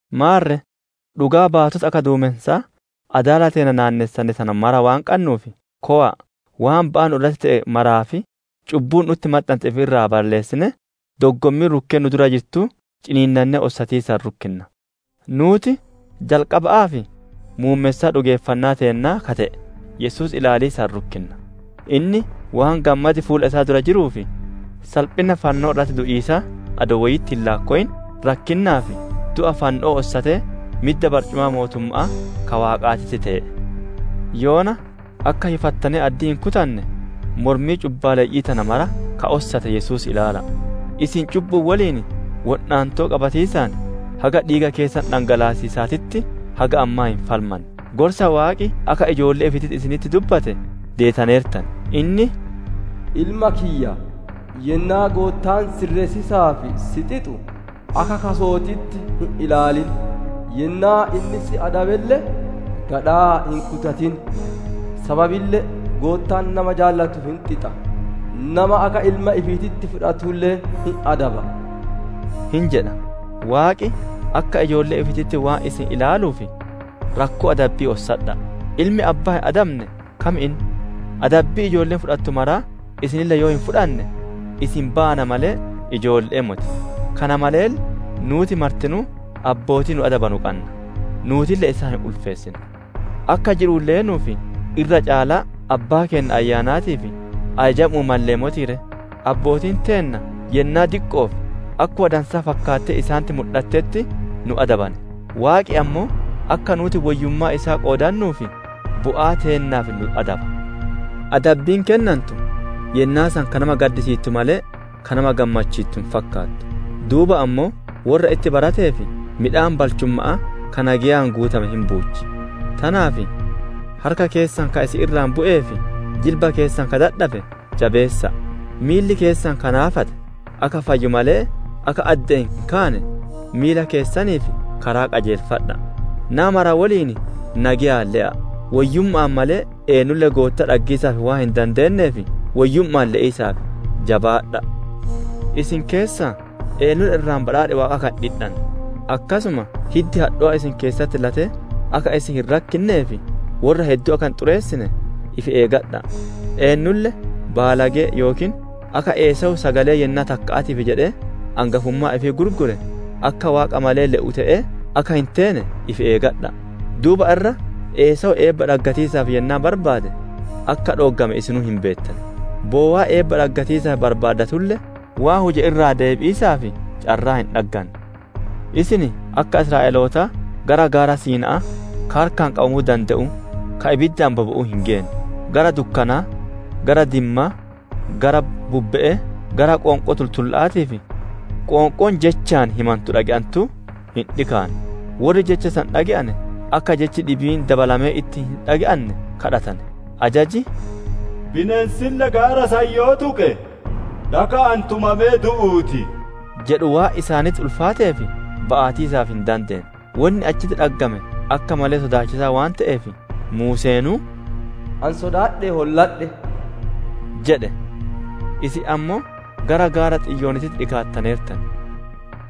Maarre dhugaa baatota akka duumensaa adaala keenna naannessane kana mara waan qannuuf, kowa'a waan ba'aa nu irratti te'e maraa fi cubbuu nu'utti maxxante ifi irraa balleessinee, doggommii rukkee nu dura jirtuu ciniinnannee ossatiisaan rukkinna. Nuuti jalqaba'aa fi muummessaa dhugeeffannaa teennaa ka te'e Yesuus ilaaliisaan rukkinna; inni waan gammadi fuula isaa dura jiruuf, salphinna fannoo irratti du'iisaa adoo woyitti hin laakkowin, rakkinnaa fi du'a fanno'oo ossatee midda barcumaa mootumma'aa ka Waaqaatitti tee'e. Yoona akka hifattanee addii hin kutanne, mormii cubbaaleyyi'ii tana mara ka ossate Yesuus ilaala'a. Isin cubbu'uun woliin wodhaantoo qabatiisaan haga dhiiga keessan dhangalaasiisaatitti haga ammaa hin falmanne. Gorsa Waaqi akka ijoollee ifiititti isinitti dubbate deetaneertan; inni, «Ilma kiyya! Yennaa Goottaan sirreessiisaaf si xixu, akka kaso'ootitti hin ilaalin; yennaa inni si adabelle, gadhaa hin kutatin! Sababille Goottaan nama jaalatu hin xixa; nama akka ilma ifiititti fudhatulle hin adaba» jedha. Waaqi akka ijoollee ifiititti waan isin ilaaluuf, rakkoo adabbi'ii ossadha'a! Ilmi abbaan hin adabane kam inni? Adabbii ijoolleen fudhattu maraa isinille yoo hin fudhanne, isin baana malee ijoolle'ee moti. Kana maleelle nuuti martinuu abbootii nu adabanu qanna; nuutille isaan hin ulfeessina. Akka jiru'uun leenuuf irra caalaa Abbaa keenna ka ayyaanaatiif ajajamu'uu mallee motii ree? Abbootiin teenna yennaa diqqo'oof akkuma dansaa fakkaattee isaanitti mudhattetti nu adabane; Waaqi ammoo akka nuuti woyyummaa isaa qoodannuuf, bu'aa teennaaf nu adaba. Adabbiin kennantu yennaa san ka nama gaddisiittu malee, ka nama gammachiittu hin fakkaatu; duuba ammoo worra itti barateef midhaan balchumma'aa ka nageyaan guutame hin buuchi. Tanaaf harka keessan ka isin irraa bu'ee fi jilba keessan ka dadhabe jabeessa'a! Miilli keessan ka naafate akka fayyu malee akka adde'een hin kaane, miila keessaniif karaa qajeelfadha'a. Nama maraa woliin nageyaan le'a! Woyyumma'aan malee, eennulle Goottaa dhaggiisaaf waan hin dandeenneef, woyyumma'aan le'iisaaf jabaadha'a. Isin keessaa eennulle irraa badhaadhi Waaqaa akka hin dhidhanne, akkasuma hiddi hadhowaan isin keessatti latee akka isin hin rakkinnee fi worra hedduu akka hin xureessine ifi eeggadha'a. Eennulle baalagee, yookiin akka Esaawuu sagalee yennaa takka'aatiif jedhee, angafummaa ifii gurguree ka Waaqa malee le'u te'ee, akka hin teene ifi eeggadha'a. Duuba irra Esaawu eebba dhaggatiisaaf yennaa barbaade, akka dhooggame isinuu hin beettan; bowaa eebba dhaggatiisaaf barbaadatulle, waan huje irraa deebi'iisaaf carraa hin dhagganne. Isin akka Israa'elootaa gara gaara Siina'aa ka harkaan qabamuu dande'uu, ka ibiddaan bobe'uu hin geenne; gara dukkanaa, gara dimmaa, gara bubbe'ee, gara qoonqoo tultulla'aatii fi qoonqoon jechaan himantu dhage'antuu hin dhikaanne; worri jecha san dhage'ane akka jechi dhibiin dabalamee itti hin dhage'anne kadhatane. Ajaji, «Bineensille gaara san yoo tuqe, dhaka'aan tumamee du'uu ti» jedhu waan isaanitti ulfaateef, ba'atiisaaf hin dandeenne. Wonni achitti dhaggame akka malee sodaachisaa waan te'eef, Muuseenuu, «Ani sodaadhee holladhe» jedhe. Isin ammoo gara gaara Xiyoonii dhikaattaneertan;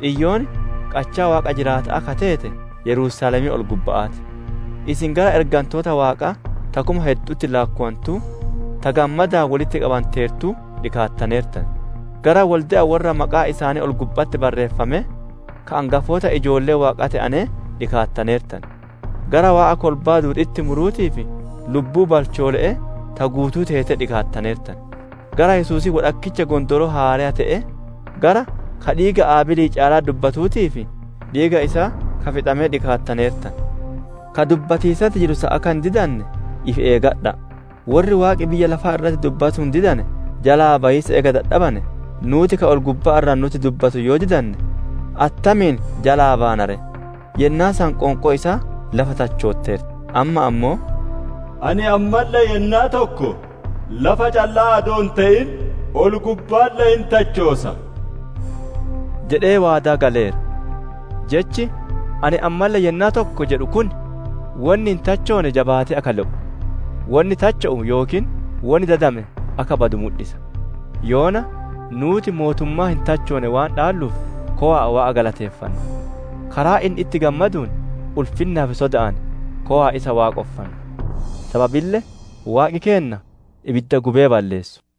Xiyoon qachaa Waaqa jiraata'aa ka teete Yerusaalemii ol-gubba'aa ti; isin gara ergantoota Waaqaa ta kuma heddu'utti laakkowantuu, ta gammadaan wolitti qabanteertuu dhikaattaneertan. Gara Wolde'a worra maqaan isaanii ol-gubba'atti barreeffamee, ka angafoota ijoollee Waaqaa te'anee dhikaattaneertan. Gara Waaqa kolbaa duudi'itti muruutii fi lubbuu balchoole'ee ta guutuu teetee dhikaattaneertan. Gara Yesuusii wodhakkicha gondooroo haareyaa te'ee, gara ka dhiiga Abeelii caalaa dubbatuutii fi dhiiga isaa ka fixamee dhikaattaneertan. Ka dubbatiisatti jiru san akka hin didanne ifi eeggadha'a! Worri Waaqi biyya lafaa irratti dubbatuun didane jalaa bayiisa eega dadhabane, nuuti ka ol-gubbaa irraa nutti dubbatu yoo didanne attamiin jalaa baana ree! Yennaa san qoonqoon isaa lafa tachooteerti; amma ammoo, «Ani ammalle yennaa tokko, lafa callaa adoo hin te'in, ol-gubbaalle hin tachoosa» jedhee waadaa galeera. Jechi, «Ani ammalle yennaa tokko» jedhu kun, wonni hin tachoone jabaatee akka le'u, wonni tacho'u yookiin wonni dadame akka badu mudhisa. Yoona nuuti mootummaa hin tachoone waan dhaalluuf kowa'a Waaqa galateeffanna; karaa inni itti gammaduun, ulfinnaa fi soda'aan kowa'a isa Waaqonfanna. Sababille Waaqi keenna ibidda gubee balleessu.